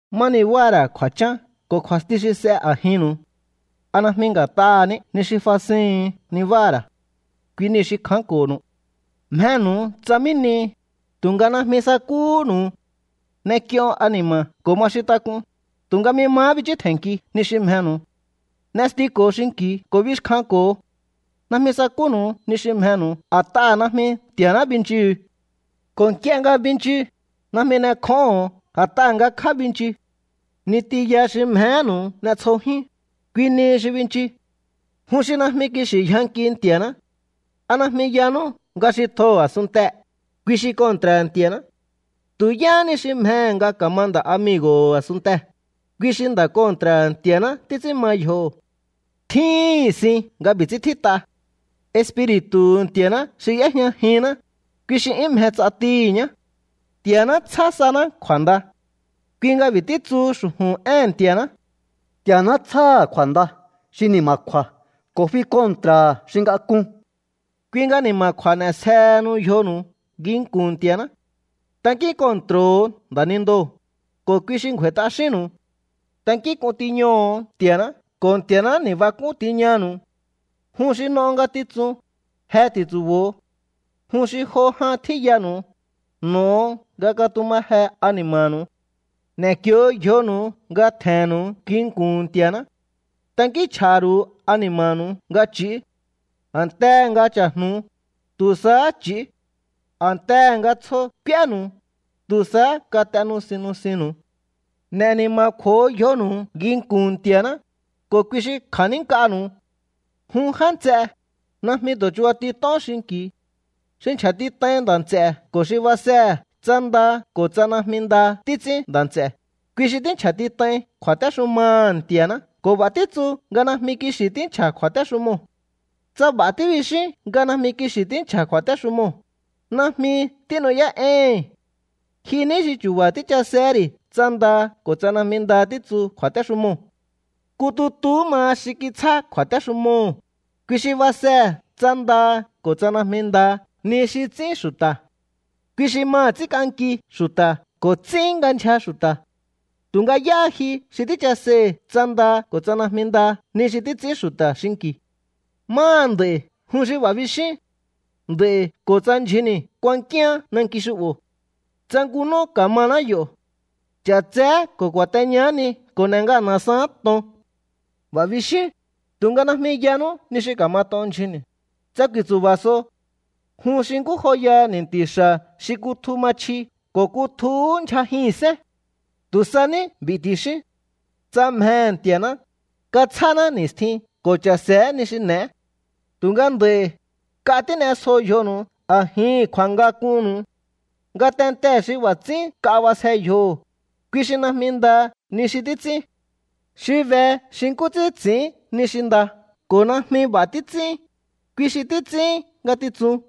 ¿Má nibáha̱ ra̱ kju̱a̱chán ko̱ kju̱a̱sti xi s'e a̱jinnu̱u? ¿A najmi nga̱t'aha̱ ní ni xi fasihu̱un nibáha̱ ra̱? Kui niu̱ xi kjánko̱nu̱u. Mjenu̱u tsa mí nihi, tu̱nga najmi sakúhúnu̱u. N'ek'ion ani̱ma̱ ko̱ ma xintak'un, tu̱nga najmi mahá bichú tje̱nnkiu ni xi mjenu̱u. N'estiko̱o xinki̱u ko̱ bixkjanko̱o. Najmi sakúnu̱u ni xi mjenu̱u a̱t'aha̱ najmi Nti̱a̱ná binchuhu̱u. Ko̱ nk'ie nga binchu, najmi n'ekjóho̱on a̱t'aha̱ ngakjá binchu. Ni tiya xi mjehénu̱u n'e̱tsjojíún, kui nihi xi binchu. ¡Jun xi najmi kixi̱ yjankiu Nti̱a̱ná! ¿A najmi yanú nga xi tjoho̱ a̱sunntee̱, kui xi kontra̱ha̱ Nti̱a̱ná? Tu̱ yáhá ni xi mjehe̱ nga ka̱ma nda̱migo̱ho̱ a̱sunntee̱, kui xi nda̱ kontra̱ha̱ Nti̱a̱ná títs'ín ma yjoho̱. Tjíhi̱n sin nga b'i̱ ts'ín tjít'a: “Espiri̱tu̱hu̱ Nti̱a̱ná xi y'éjñajinná, kui xi 'yún mje ts'atihi̱ ñá.” Nti̱a̱ná tsjá saná kju̱a̱nda. Kui nga b'i̱ títsuhu xu̱ju̱n éhe̱n Nti̱a̱ná: “Nti̱a̱ná tsjáha̱ kju̱a̱nda xi ni̱ma̱kju̱a̱ ko̱ fi kontra̱ha̱ xi ngak'un.” Kui nga ni̱ma̱kju̱a̱ n'e̱sjehenu yjonu̱u nginku̱n Nti̱a̱ná. Tankín kontro̱ho̱o nda̱nindoo̱, ko̱ kui xi ngju̱a̱i̱ t'axínnu̱u. Tankínk'un tiñoho̱o Nti̱a̱ná, ko̱ Nti̱a̱ná ni̱bak'ún tiñanu̱u. Jun xi n'o ngatitsun, je ti̱ntsu̱bo̱o. Jun xi jo jan tjíyanu̱u, n'o̱o nga katumaje ani̱ma̱nu̱u. N'e̱kio yjonu̱u nga tje̱nnu̱u nginku̱n Nti̱a̱ná. Tankínchj'a̱ha̱ ru̱u ani̱ma̱nu̱u nga ch'i̱ú. A̱ntehe̱ nga cha̱jnu̱u, tu̱ sahá ch'i̱ú. A̱ntehe̱ nga tsjo k'úénu̱u, tu̱ sahá kat'e nusin nusinnu̱u. N'e̱ ni̱ma̱kju̱o yjonu̱u nginku̱n Nti̱a̱ná, ko̱ kui xi kja̱nínk'anu̱u. Jun já nts'e, najmi tu̱ chubatit'ón xinki̱u. Xi nchja̱tit'ain nda̱ nts'e̱ ko̱ xi basehe̱ tsa nda ko̱ tsa najmi nda títs'ín nda̱ nts'e̱, kui xi tínchja̱tit'ain kju̱a̱téxumaha̱ Nti̱a̱ná ko̱ b'a̱ títsu nga najmi kixi̱ tínchja̱ kju̱a̱téxumoo̱. Tsa b'a̱ tíbixín nga najmi kixi̱ tínchja̱ kju̱a̱téxumoo̱, najmi tínu'yá'éíhi̱n. Ji ní xi chu̱ba̱ tíchasehé ri̱ tsa nda ko̱ tsa najmi nda títsu kju̱a̱téxumoo̱. Nku tutuhú maha xi kitsjá kju̱a̱téxumoo̱, kui xi basehe̱ tsa nda ko̱ tsa najmi nda ni xi ts'ín xu̱ta̱. Kui xi maha̱ ts'ínk'anki xu̱ta̱ ko̱ ts'ín nga ndyja xu̱ta̱. ¿Tu̱nga yáha ji xi tíchaseihi̱ tsa nda ko̱ tsa najmi nda ni xi títs'ín xu̱ta̱ xinki̱? Máha nd'a̱i̱ jun xi b'a̱ bixíún: “Nd'a̱i̱ ko̱ tsa ndyjunni̱ kuankíaán nanki xu'bo̱. Tsa nku nú ka̱maná yo̱. Ch'a̱tseé ko̱ ku̱a̱teñaá ni ko̱ n'e̱ ngana̱saán to̱on.” B'a̱ bixíún, tu̱nga najmi yanú ni xi ka̱mat'on ndyjunni̱, tsa ku̱i̱ntsu̱ba̱ so. Jun xi nkú joyaha ni̱nti̱ xa̱ xi kutju ma chji ko̱ kutjuhú ndyjajihi̱nsén. Tu̱ sa ní b'i̱ ti̱xíún: “Tsa mjehe̱ Nti̱a̱ná, katsjáná ni̱stjín ko̱ cha̱se̱é ni xi n'e̱é.” Tu̱nga nd'a̱i̱, nk'a tín'esjo yjonu̱u a̱jihi̱n kju̱a̱ngak'unnu̱u. Ngatentee̱ xi b'a̱ ts'ín nk'a b'asje yjoho̱, kui xi najmi nda ni xi títs'ín. Xi be xi nkú ts'ín ts'i̱ín ni xi nda ko̱ najmi b'a̱ títs'ín, kui xi títs'ín ngatitsun.